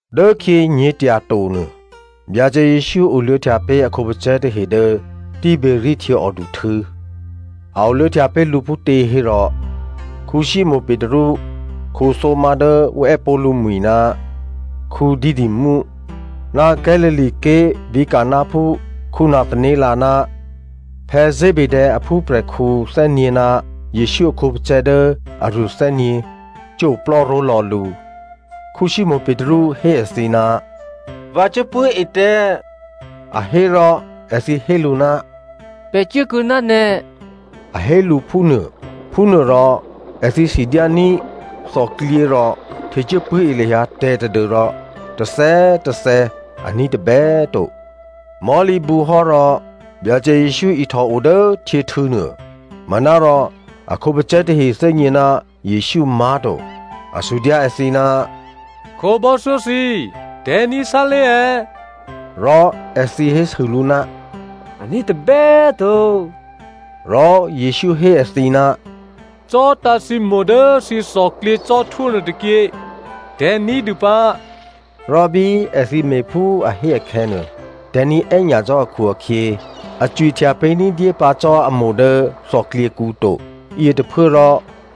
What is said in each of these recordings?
Dốkhyě nyě̤tyato nuô, Byacè Jesǔ oluô̌htya pé̤ a khǒpacè̤̌ tahe dố Tiberia htyěòduhtû̌. A oluô̌htya pé̤ lǔ phútě hérò, Simonè Petru, Thomazo dố ǔ è́pó̤ lǔmwi̤ ná Didymo, ná Galilea ké̤ vǐ̤ Cananphú Nathanael ná Zebedeo aphúprè̤khǔ thè́nyě̤ ná Jesǔ a khǒpacè̤̌ dố aruô thè́nyě̤ cuố oplò́ ró̤lò̌ lǔ. Simonè Petru hé èthǐ, “Vǎ cuốpṳ̂́e tè̤̌,” a hé rò, èthǐ hé lǔ, “Pè̤ cuốkuô̌ ná nè̤,” a hé lǔ phúnuô. Phúnuôrò èthǐ sidyání̤ thòklyě rò htecuố pṳ̂́e lahyǎ tè̤̌ tadû́rò tôthè̌꤮ tôthè̌ a ní̤ tôbè꤮ to. Mò̤́lǐbǔhò́ rò Byacè Jesǔ ihtòo dố htyěhtû̌ nuô, manárò a khǒpacè̤̌ tahe thè́gně ná Jesǔ má̤to. A sudyǎ èthǐ, “Khǒbò́thyó thǐ, tè̤̌ ní̤ sálé̤ è̌?” Rò èthǐ hésû lǔ, “Aní̤ tôbè꤮ to.” Rò Jesǔ hé èthǐ, “Vǐtǎ̤ thǐ itavǐ dố thǐ thòklyě cò́htwó nuôtôkyě, tè̤̌ ní̤dû pǎ.” Rò bí èthǐ me̤phú a hé akhè̌nuô, tè̤̌ní̤ è́nyacò́ akhu-akhyě, a cwihtya pé̤ ní̤dyé pǎ cò́ a itavǐ dố thòklyěkǔ to. Yětôphuốrò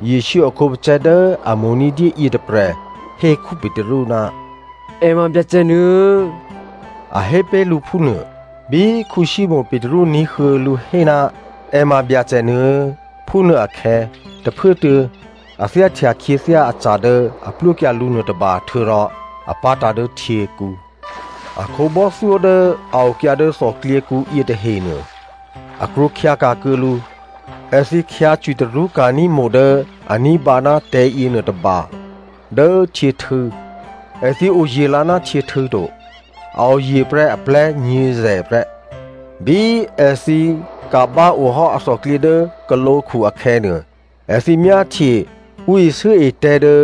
Jesǔ a khǒpacè̤̌ dố a mo̤ ní̤dyé yětôprè̤ hé Petru, “È ma Byacè nuô꤮” a hé pé̤ lǔ phúnuô. Bí Simonè Petru ní̤huô̌ lǔ hé, “È ma Byacè nuô꤮,” phúnuô akhè̌, tôphuốtuô̌ a thyáhtya khyěthyá aca̤ dố a plwókyǎ lǔ nuôtôba htuô̌rò a pá̤tǎ̤ dố htyěkǔ. A khǒbò́thyó dố a okyǎ dố thòklyěkǔ yětahenuô, a krwǒkhyǎka̤ kuô̌ lǔ. Èthǐ khyǎ cwitarṳ́ ka̤ní̤ itavǐ dố a ní̤bǎ ná tè̤̌ yěnuôtôba dố htyěhtû̌. Èthǐ oye̤ lǎ ná htyěhtû̌ to, a oye̤ prè́ aplè̤́ nyě̤zè̤ prè́. Bí èthǐ ka̤bá ohò́ athòklyě dố khǒlǒkhu akhè̌nuô, èthǐ myáhtye ǔ isû́e tè̤̌ dố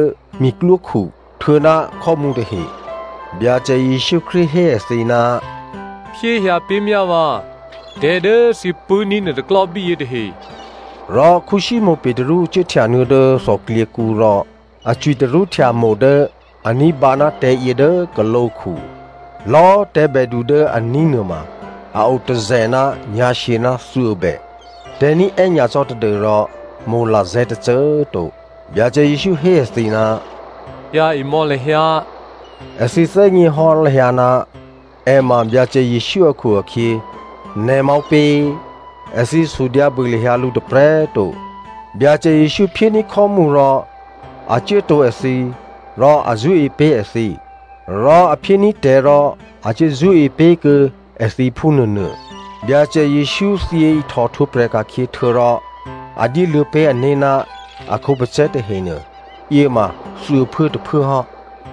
miklwókhu htuô̌ná khò́mǔ tahe. Byacè Jesǔ Krístu hé èthǐ, “Phyé hyǎpé̤myá vǎ tè̤̌ dố thǐ pṳ̂́ní̤ nuôtôklò́ bíyě tahe.” Rò Simonè Petru cuốhtyanuô̌ dố thòklyěkǔ rò a cwitarṳ́htya itavǐ dố a ní̤bǎ ná tè̤̌yě dố khǒlǒkhu. Lò̌꤮ tè̤̌bèdu dố a ní̤ nuôma a o tôzè̤ ná nyǎ̤shyě ná thuô̌bè. Tè̤̌ ní̤ è́nyacò́ tadû́rò itavǐ lazè̤̌ tôcô꤮ to. Byacè Jesǔ hé èthǐ, “Hyǎ emò̌ lahyǎ.” Èthǐ thè́gněhò́ lahyǎ ná è ma Byacè Jesǔ akhu-akhyě, “Nè̤ ma ǔpě?” Èthǐ sudyǎ bû lahyǎ lǔ tôprè̤꤮ to. Byacè Jesǔ phyéní̤ khò́mǔ rò a cuốtǒ èthǐ rò a zṳ́e pé̤ èthǐ. Rò a phyéní̤ tè̤̌ rò a cuố zṳ́e pé̤kuô̌ èthǐ phúnuônuô. Byacè Jesǔ thyě ihtòhtwǒprè̤ ka̤khyě htuô̌rò a dyéluô̌ pé̤ ané̤ ná a khǒpacè̤̌ tahenuô, yě ma thuô̌phuốtôphuố hò́.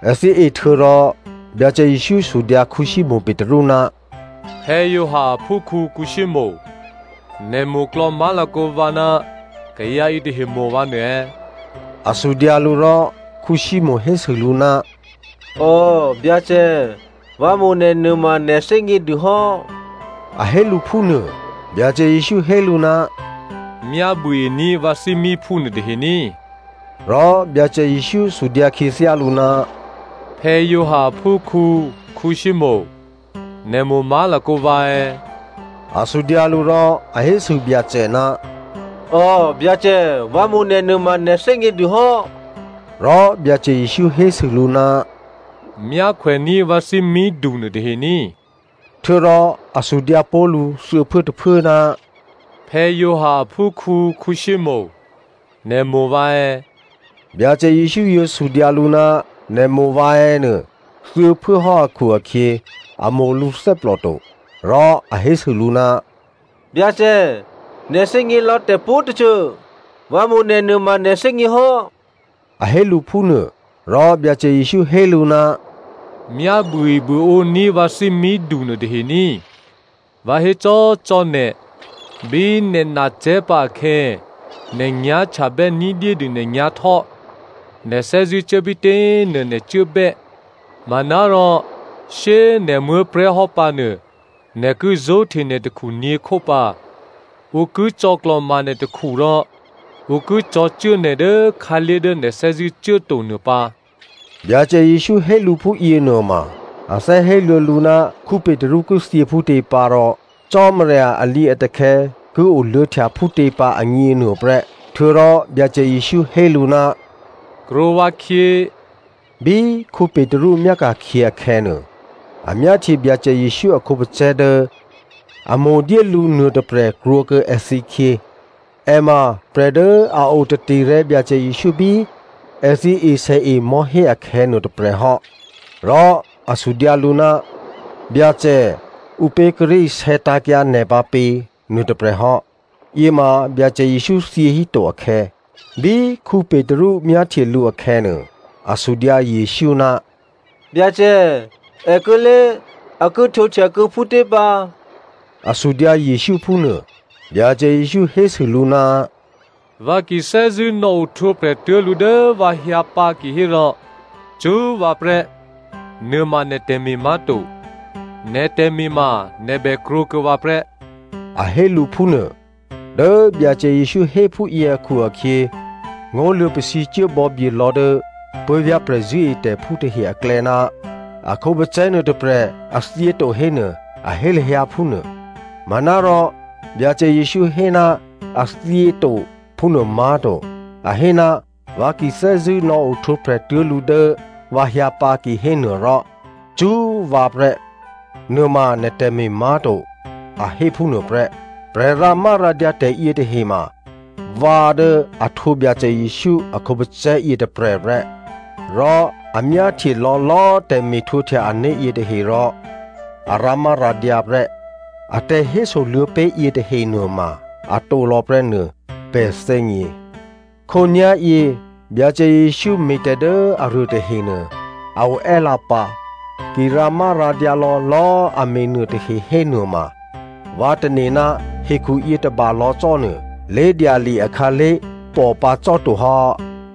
Èthǐ e htuô̌rò, Byacè Jesǔ sudyǎ Simonè Petru, “Giovanni aphúkhǔ Simonè, nè̤ mo̤klò̌ má̤lakǒ vǎ ná kayǎ yětahe mo̤ vǎ nuô è̌?” A sudyǎ lǔ. Rò Simonè hésû lǔ, “Ò, Byacè, vǎ mo̤ nè̤ nuôma nè̤ thè́gnědû hò́,” a hé lǔ phúnuô. Byacè Jesǔ hé lǔ, “Myá buôení̤ vǎ thímíphú nuôtahe ní꤮.” Rò Byacè Jesǔ sudyǎ khyěthyá lǔ, “Giovanni aphúkhǔ Simonè, nè̤ mo̤ má̤lakǒ vǎ è̌?” A sudyǎ lǔ. Rò a hésû Byacè, “Ò, Byacè, vǎ mo̤ nè̤ nuôma nè̤ thè́gnědûhò́.” Rò Byacè Jesǔ hésû lǔ, “Myákhwèní̤ vǎ thímídu nuôtahe ní꤮.” Htuô̌rò a sudyǎ pó̤ lǔ thuô̌phuốtôphuố, “Giovanni aphúkhǔ Simonè, nè̤ mo̤ vǎ è̌?” Byacè Jesǔ yǒ sudyǎ lǔ, “Nè̤ mo̤ vǎ è̌?” nuô thuô̌phuốhò́ akhu-akhyě, a mo̤ lǔthè́plò to. Rò a hésû lǔ, “Byacè, nè̤ thè́gně lò̌ tè̤pwǒ̤tôcô, vǎ mo̤ nè̤ nuôma nè̤ thè́gně hò́,” a hé lǔ phúnuô, Rò Byacè Jesǔ hé lǔ, “Myá buôebuôǒní̤ vǎ thímídu nuôtahe ní꤮. Vǎ hécò́cò́ nè̤, bí nè̤ nacè̤́pǎ akhè̌, nè̤ nyá̤htyabè́ ní̤dyédû nè̤nyá̤htò́, nè̤ thè́zṳ̂́cuố bítě꤮ nuô nè̤ cuốbè́. Manárò shyé꤮ nè̤ muố̤prè̤́hò́ pǎnuô, nè̤ ki zó̤hte nè̤ takhu nyě̤khó pǎ. Ǔ ki cò̌klò̤ma nè̤ takhu rò ǔ ki cò̤̌cuố nè̤ dố khǎlé̤ dố nè̤ thè́zṳ̂́ cuố to nuô pǎ.” Byacè Jesǔ hé lǔ phúyě nuôma, a thè́ héluô̌ lǔ ná Petru ki thyě phútě pǎ rò Cò́marya alǐatakhè̌ ki oluô̌htya phútě pǎ agněnuô prè́. Htuô̌rò Byacè Jesǔ hé lǔ, “Krwǒ vǎkhyě.” Bí Petru myáka̤khyě akhè̌nuô, a myáhtye Byacè Jesǔ a khǒpacè̤̌ dố a mo̤dyé lǔ nuôtôprè̤ krwǒkuô̌ èthǐkhyě. (È ma prè̤ dố a o taterè̤̌ Byacè Jesǔ bí èthǐ esèe mò̤́hé akhè̌ nuôtôprè̤ hò́, rò a sudyǎ lǔ, “Byacè, ǔpě kíré̤ isè̌tǎ̤kyǎ nè̤ pǎ pě?” nuôtôprè̤ hò́. Yěma Byacè Jesǔ thyěhíto akhè̌) bí Petru myáhtye lǔ akhè̌nuô, a sudyǎ Jesǔ, “Byacè, èkuô̌lě, a ki htwǒhtyakuô̌ phútě pǎ?” A sudyǎ Jesǔ phúnuô. Byacè Jesǔ hésû lǔ, “Vǎ ki thè́zṳ̂́ nò̌ohtwǒprè̤ tuố̤ lǔ dố vǎ hyǎpǎ kihérò, cṳ́ vǎ prè́. Nuôma nè̤ tè̤me̤ má̤to, nè̤ tè̤me̤ ma nè̤ bè krwǒkuô̌ vǎ prè́,” a hé lǔ phúnuô. Dố Byacè Jesǔ hé phúyě akhu-akhyě, ngó̤ luô̌pasǐcuố bò̌byelò̌ dố puố̤vyá̤ prè̤zṳ̂́etè̤phú tahe aklè̌ ná a khǒpacè̤̌ nuôtôprè̤ a thyěto hénuô̌, a hé lahyǎ phúnuô. Manárò Byacè Jesǔ hé ná a thyěto phúnuô má̤to. A hé, “Vǎ ki thè́zṳ̂́ nò̌ohtwǒprè̤ tuố̤ lǔ dố vǎ hyǎpǎ kihénuô rò cṳ́ vǎ prè́, nuôma nè̤ tè̤me̤ má̤to,” a hé phúnuô prè́. Prè̤ rǎmárǎdyǎ tè̤ yětahe ma vǎ dố a htwǒ Byacè Jesǔ a khǒpacè̤̌ yětôprè̤ prè́, rò a myáhtye lò̌lò̌꤮ tè̤me̤htwǒhtya ané̤ yětahe rò a rǎmárǎdyǎ prè́. A tè̤hésoluô̌ pé̤ yětahe nuôma atǒ lò̌ prè́ nuô pè̤ thè́gně. Khǒnyá̤yě, Byacè Jesǔ me̤tè̤ dố aruô tahenuô a oè́lǎpǎ. Ki rǎmárǎdyǎ lò̌lò̌꤮ a me̤ nuôtahe hénuôma, vǎ tane̤ ná hekhuyě tôbalò̌ cò́nuô, lé̤dyali akhǎlé̤ pòpǎ cò́to hò́.